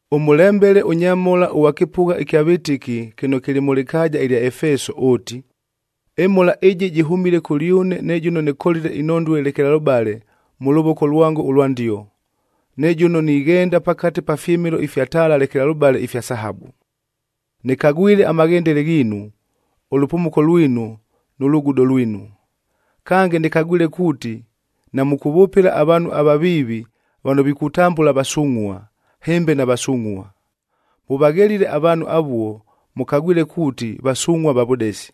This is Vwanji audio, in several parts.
“Ʉmʉlembele ʉnyamhola ʉghwa kɨpʉgha ɨkya vɨtɨki kɨno kɨlɨ mʉ lɨkaaja ɨlya Efeso ʉʉti, ‘Ɨmhola ɨjɨ jɨhʉmile kʉlyʉne ne jʉno nɨkolile inhondue lekelalʉbale mʉ lʉvoko lwango ʉlwa ndio, ne jʉno nighenda pakate pa fyɨmɨlo ifya taala lekelalʉbale ifya sahabu. Nɨkagwile amaghendele ghiinu, ʉlʉpumuko lwinu nʉ lugudo lwinu. Kange, nɨkagwile kuuti namʉkʉvʉpɨla avaanhu avaviivi vano vikutambʉla vasungʼhua, hɨmbe navasungʼhua. Mʉvaghelile avaanhu avuo, mʉkagwile kuuti vasungʼhua va vʉdesi.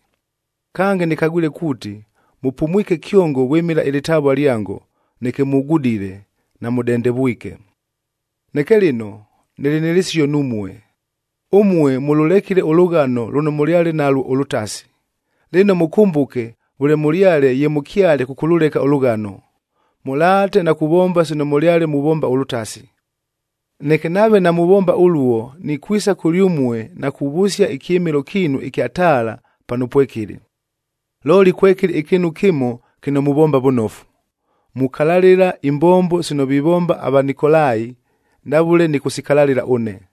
Kange, nɨkagwile kuuti mʉpumwike kyongo vwɨmɨla ɨlɨtavua lyango, neke mugudile, namʉdendevwike. Neke lɨno, nɨlɨ nɨ lɨsio numue. Ʉmue mʉlʉlekile ʉlʉghano lʉno mʉlyale nalwo ʉlʉtasi! Lɨno mʉkʉmbʉke vʉle mʉlyale ye mʉkyale kʉkʉlʉleka ʉlʉghano. Mʉlaate na kuvomba sino mʉlyale muvomba ʉlʉtasi. Neke nave namuvomba ʉluo, nikwisa kʉlyʉmue na kuvʉsia ɨkyɨmɨlo kiinu ɨkya taala pano pwekɨlɨ. Looli kwekɨlɨ ɨkɨɨnu kɨmo kɨno muvomba vʉnofu: mukalalɨla imbombo sino vivomba aVanikolaia ndavʉle nɨkʉsikalalɨla ʉne.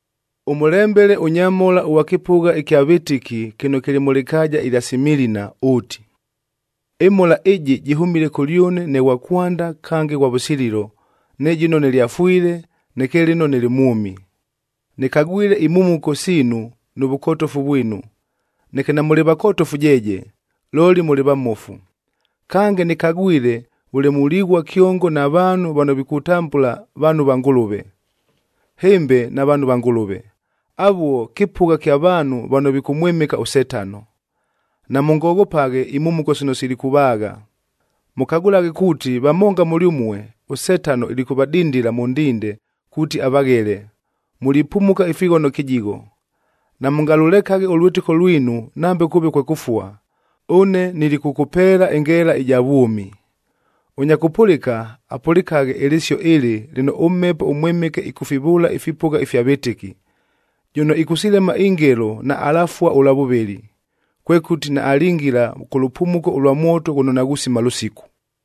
“Ʉmʉlembele ʉnyamhola ʉghwa kɨpʉgha ɨkya vɨtɨki kɨno kɨlɨ mʉ lɨkaaja ɨlya Similina ʉʉti, ‘Ɨmhola ɨjɨ jɨhʉmile kʉlyʉne ne ghwa kwanda kange ghwa vʉsililo, ne jʉno nɨlyafwile, neke lɨno nɨlɨ mwʉmi. Nɨkagwile imhumuko siinu nʉ vʉkotofu vwinu, neke namʉlɨ vakotofu jeeje, looli mʉlɨ vamofu! Kange, nɨkagwile vʉle mulighua kyongo na vaanhu vano vikutambʉla vaanhu va Ngʉlʉve, hɨmbe navaanhu va Ngʉlʉve. Avuo, kɨpʉgha kya vaanhu vano vikʉmwɨmɨka ʉSetano. Namʉngoghopaghe imhumuko sino silikʉvaagha. Mʉkagʉlaghe kuuti vamonga mʉlyʉmue, ʉSetano ilikʉvadindila mʉ ndinde kuuti avaghele, mulipumuka ifighono kɨjigho. Namʉngalʉlekaghe ʉlwɨtɨko lwinu nambe kʉʉve kwe kʉfua, ʉne nilikʉkʉpeela ɨngeela ɨja vwʉmi. Ʉnya kʉpʉlɨka, apʉlɨkaghe ɨlɨsio ɨlɨ lɨno ʉMhepo ʉMwɨmɨke ɨkʉfivʉʉla ifipʉgha ifya vɨtɨki. Jʉno ɨkʉsilema ingelo naalafua ʉlwa vʉvɨlɨ, kwekʉti naalingila kʉ lʉpumuko lwa mwoto ghʉno naghusima lʉsiku.’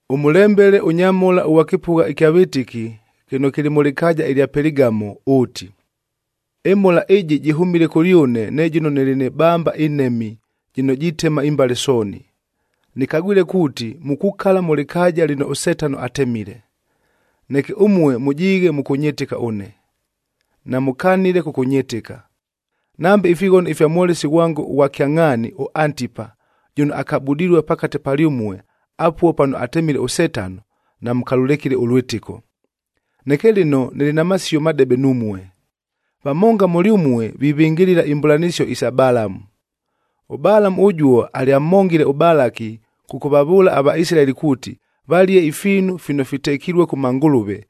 “Ʉmʉlembele ʉnyamhola ʉghwa kɨpʉgha ɨkya vɨtɨki kɨno kɨlɨ mʉ lɨkaaja ɨlya Peligamo ʉʉti, ‘Ɨmhola ɨjɨ jɨhʉmile kʉlyʉne ne jʉno nɨlɨ nɨ bamba ɨnhemi jɨno jitema imbale sooni. Nɨkagwile kuuti mukukala mʉ lɨkaaja lɨno ʉSetano atemile. Neke ʉmue mʉjiighe mʉkʉnyɨtɨka ʉne, namʉkanile kʉkʉnyɨtɨka. Nambe ifighono ifya mwolesi ghwango ʉghwa kyangʼhaani ʉAntipa, jʉno akabudilue pakate palyʉmue, apuo pano atemile ʉSetano, namʉkalʉlekile ʉlwɨtɨko. Neke lɨno nɨlɨ na masio madebe numue: vamonga mʉlyʉmue vivɨngɨlɨla imbʉlanɨsio isa Balamu. ɄBalamu ʉjuo alyamhongile ʉBalaki kʉkʉvavʉʉla aVaisilaeli kuuti, valie ifiinu fino fitekilue kʉ mangʉlʉve,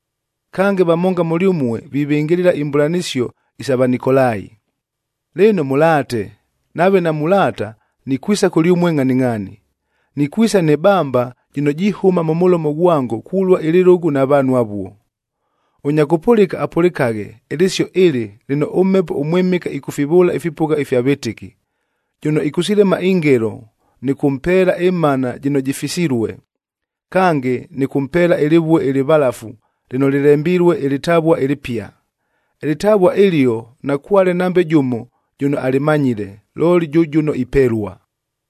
Kange, vamonga mʉlyʉmue vivɨngɨlɨla imbʉlanɨsio isa Vanikolai. Lɨno mʉlaate, nave namulaata, nikwisa kʉlyʉmue ngʼhaningʼhaani. Nikwisa nɨ bamba jɨno jihʉma mʉ mʉlomo ghwango kulua ɨlɨlʉgʉ na vaanhu avuo. Ʉnya kʉpʉlɨka, apʉlɨkaghe ɨlɨsio ɨlɨ lɨno ʉMhepo ʉMwɨmɨke ɨkʉfivʉʉla ifipʉgha ifya vɨtɨki. Jʉno ɨkʉsilema ingelo nɨkʉmpeela ɨmanad jɨno jɨfisilue, kange nɨkʉmpeela ɨlɨvue ɨlɨvalafu lɨno lɨlembilue ɨlɨtavua ɨlɨpia. Ɨlɨtavua ɨlio nakwale nambe jʉmo jʉno alɨmanyile, looli jʉ jʉno ipelua.’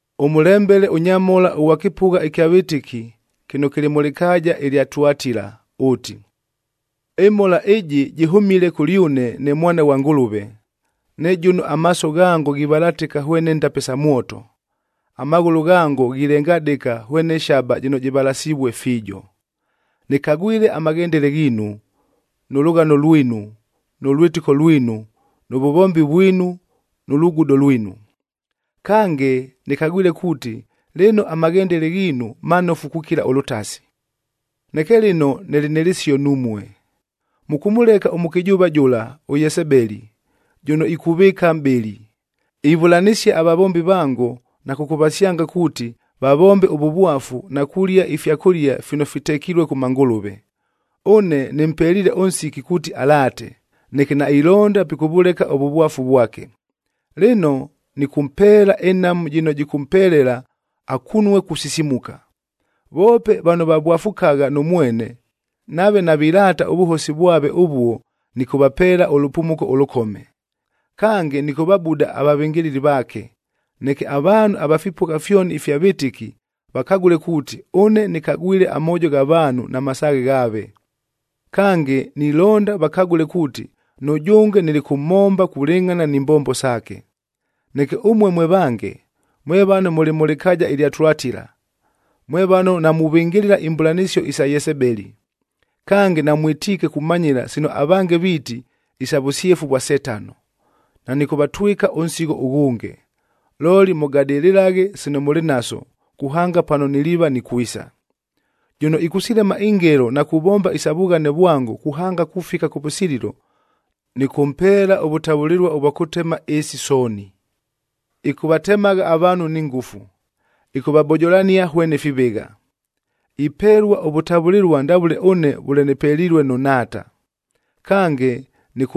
“Ʉmʉlembele ʉnyamhola ʉghwa kɨpʉgha ɨkya vɨtɨki kɨno kɨlɨ mʉ lɨkaaja ɨlya Tuatila ʉʉti, Ɨmhola ɨjɨ jɨhʉmile kʉlyʉne ne Mwana ghwa Ngʉlʉve,e ne jʉno amaaso ghango ghivalatɨka hwene ndape sa mwoto, amaghʉlʉ ghango ghilengadɨka hwene shaba jɨno jɨvalasivue fiijo. Nɨkagwile amaghendele ghiinu, nʉ lʉghano lwinu, nʉ lwɨtɨko lwinu, nʉ vʉvombi vwinu nʉ lugudo lwinu. Kange, nɨkagwile kuuti lɨno amaghendele ghiinu manofu kukila ʉlʉtasi. Neke lɨno nɨlɨ nɨ lɨsio numue: Mʉkʉmʉleka ʉmʉkɨjʉʉva jʉla, ʉYesebeli jʉno ikuvɨɨka mʼbɨli, ivʉlanɨsia avavombi vango na kʉkʉvasyanga kuuti, vavombe ʉvʉvwafu na kulia ifyakʉlia fino fitekilue kʉ mangʉlʉve. Ʉne nɨmpeliile ʉnsiki kuuti alaate, neke nailonda pikʉvʉleka ʉvʉvwafu vwake. Lɨno, nɨkʉmpeela ɨnhamu jɨno jɨkʉmpelela akunue kusisimuka. Voope vano vavwafukagha nʉ mwene, nave navilaata ʉvʉhosi vwave ʉvuo nɨkʉvapeela ʉlʉpumuko ʉlʉkome. Kange, nɨkʉvabuda avavɨngɨlɨli vaake, neke avaanhu ava fipʉgha fyoni ifya vɨtɨki vakagʉle kuuti, ʉne nɨkagwile amoojo gha vaanhu na masaaghe ghaave. Kange, nilonda vakagʉle kuuti nʉjʉnge nilikʉmhomba kulɨngʼhana ni mbombo saake. Neke ʉmue mwe vange, mwe vano mʉlɨ mʉ lɨkaaja ɨlya Tuatila, mwe vano namuvɨngɨlɨla imbʉlanɨsio isa Yesebeli, kange namwɨtiike kumanyɨla sino avange viiti, ‘Isa vʉsyefu vwa Setano,’ nanɨkʉvatwɨka ʉnsigho ʉghʉnge. Looli mʉgadɨlɨlaghe sino mʉlɨ naso, kuhanga pano niliiva nikwisa. Jʉno ɨkʉsilema ingelo na kuvomba isa vughane vwango kuhanga kufika kʉvʉsililo, Nɨkʉmpeela ʉvʉtavʉlɨlua ʉvwa kʉtema ɨɨsi sooni: ‘Ɨkʉvatemagha avaanhu ni ngʉfu, ɨkʉvabojolania hwene fivɨgha.’f Ipelua ʉvʉtavʉlɨlua ndavʉle ʉne vʉle nɨpelilue nʉ Nhaata. Kange,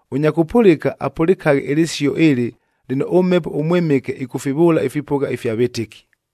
Ʉnya kʉpʉlɨka, apʉlɨkaghe ɨlɨsio ɨlɨ lɨno ʉMhepo ʉMwɨmɨke ɨkʉfivʉʉla ifipʉgha ifya vɨtɨki.